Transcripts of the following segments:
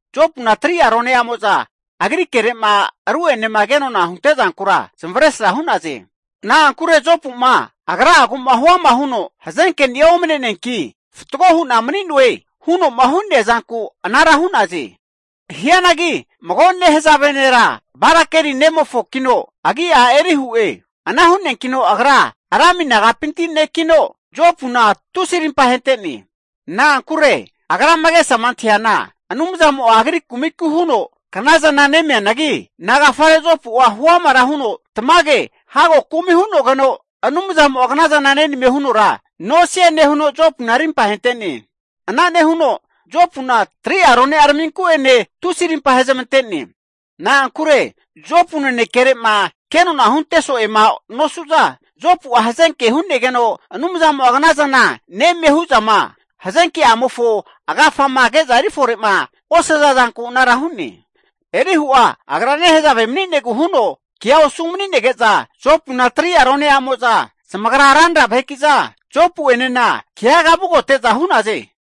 Jopuna 3'a rone'amo'za agri kere'ma ru'enema kenona hunte'zankura zamavaresra hu'naze. Na'ankure Jopu'ma agra'agu'ma huama huno, hazenkeni'a omane'neanki fatgo hu'na mani'noe huno'ma hu'nea zanku anara hu'naze. Hianagi mago nehazave nera, Barakeli nemofokino agi'a Elihu'e. Ana hu'neankino agra Rami nagapinti nekino, Jopuna tusi arimpa ahente'ne. Na'ankure agrama agesama antahiana Anumzamo'a agri kumiku huno knazana nemianagi, nagafare Jopu'a huamara huno tamage hago kumi hu'nogeno Anumzamo'a knazana nenamie hunora nosie nehuno, Jopuna arimpa ahente'ne. Ana nehuno Jopuna 3'a rone'a raminku'ene tusi arimpa ahezamante'ne. Na'ankure Jopu nanekere'ma kenona hunte so'ema nosu'za, Jopu'a hazenke hu'negeno Anumzamo'a knazana nemie hu'zama, hazenke'amofo agafama ke'za eri fore'ma osaza zanku anara hu'ne. Elihu'a agra nehazave mani'negu huno kea osu mani'nege'za, Jopuna 3'a rone'amo'za zamagra ranra vaheki'za, Jopu'enena keaga vugote'za hu'naze.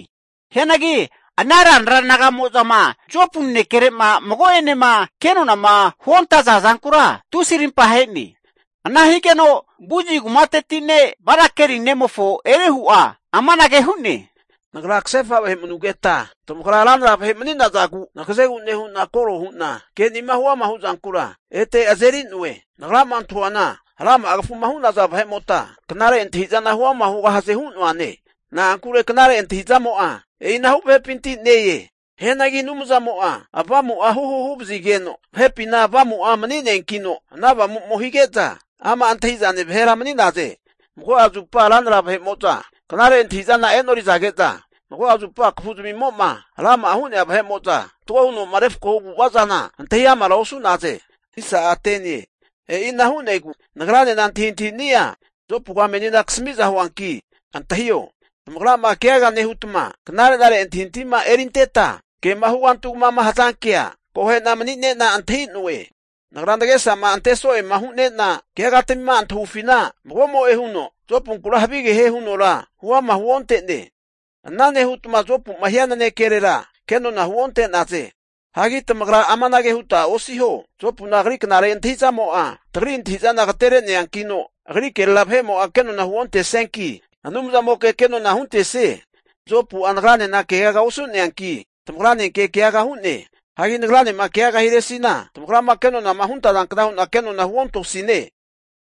Hianagi ana ranra naga'mo'zama Jopu nanekere'ma mago'enema kenona huontaza zankura, tusi arimpa ahe'ne. Ana higeno Buzi kumateti ne' Barakeli nemofo Elihu'a amanage hu'ne, Nagra kasefa vahe manugeta tamagra ranra vahe mani'nazagu nagazegu nehu'na koro hu'na ke'nima huama huzankura ete azeri'noe. Nagrama antahuana rama'a kafuma hu'naza vahe'mota knare antahi'zana huama hugahaze hu'noane. Na'ankure knare antahi'zamo'a e'inahu vahepinti ne-e. Hianagi Anumzamo'a avamu'a huhu huvazigeno vahepina avamu'a mani'neankino, ana avamumo hige'za ama' antahi'zane vahera mani'naze. Mago'a zupa ranra vahe'mo'za knare antahi'zana e'norizage'za, mago'a zupa kafuzmimo'ma rama'a hu'nea vahe'mo'za fatgo huno'ma refakohu avu'ava'zana antahi amara osu'naze. E'ina hu'negu nagranena antahintahini'a Jopuga menina kasami'za huanki antahio. Tamagrama keagama nehuta knare'nare antahintahima erinteta kema hugantugama hazankea, akohe'na mani'ne'na antahi'noe. Nagra nagesama ante so'ema hune'na keagatamima antahufina, magomo'e huno Jopunkura havige hie hunora huama huonte'ne. Ana nehutma Jopu'ma hia nanekerera kenona huonte'naze. Hagi tamagra amanage huta osiho, Jopuna agri knare antahi'zamo'a tagri antahi'zana agatereankino, agri kerera vahe'mo'a kenona huontesnianki, Anumzamoke kenona huntesie. Jopu'a nagranena keaga osu'neanki tamagranenke keaga hu'ne. Hagi nagranema keagama hiresina, tamagrama kenonama huntazankna hu'na kenona huontosine.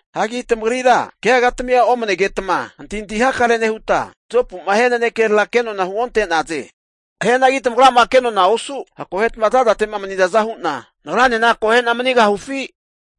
Hagi tamagrira keagatamia omanegetma antahintahi hakare nehuta, Jopu'ma hia nanekerera kenona huonte'naze. Hianagi tamagrama kenona osu, akoheta zazate'ma manizaza hu'na nagranena akohe'na manigahufi?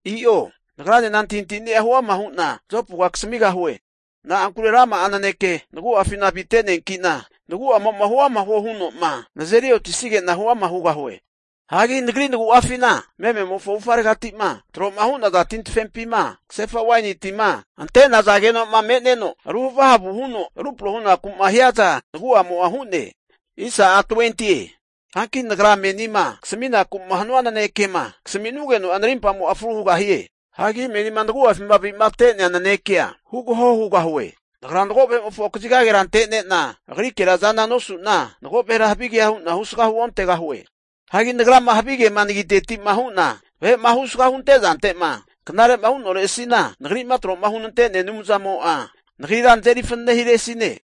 I'o. Nagranena antahintahini'a huama hu'na Jopuga kasamigahue. Na'ankure rama'a naneke nagu'afina avite'neanki'na nagu'amo'ma huama huo huno'ma nazeri otisanige'na huama hugahue. Hagi nagri nagu'afina mememofo avufgareti'ma tro'ma hu'naza tintafepima kasefa waini tima ante'nazageno'ma me'neno ruhavahavu huno rupro hunaku'ma hiaza nagu'amo'a hu'ne. Hanki nagra menima kasaminaku'ma hanua nanekema kasamisnugeno'a narimpamo'a fru hugahie. Hagi menina nagu'afima avi'mate'nea nanekea hugaho hugahue. Nagra mago vahe'mofo kazigagera antene'na agrikera azana nosu'na, mago vahera havigea hu'na husga huontegahue. Hagi nagrama havigema nagiteti'ma hu'na vahe'ma husga hunte'zante'ma knare'ma hu'noresi'na, nagri'ma tro'ma hunante'nea Anumzamo'a nagrira nazeri fanane hiresine.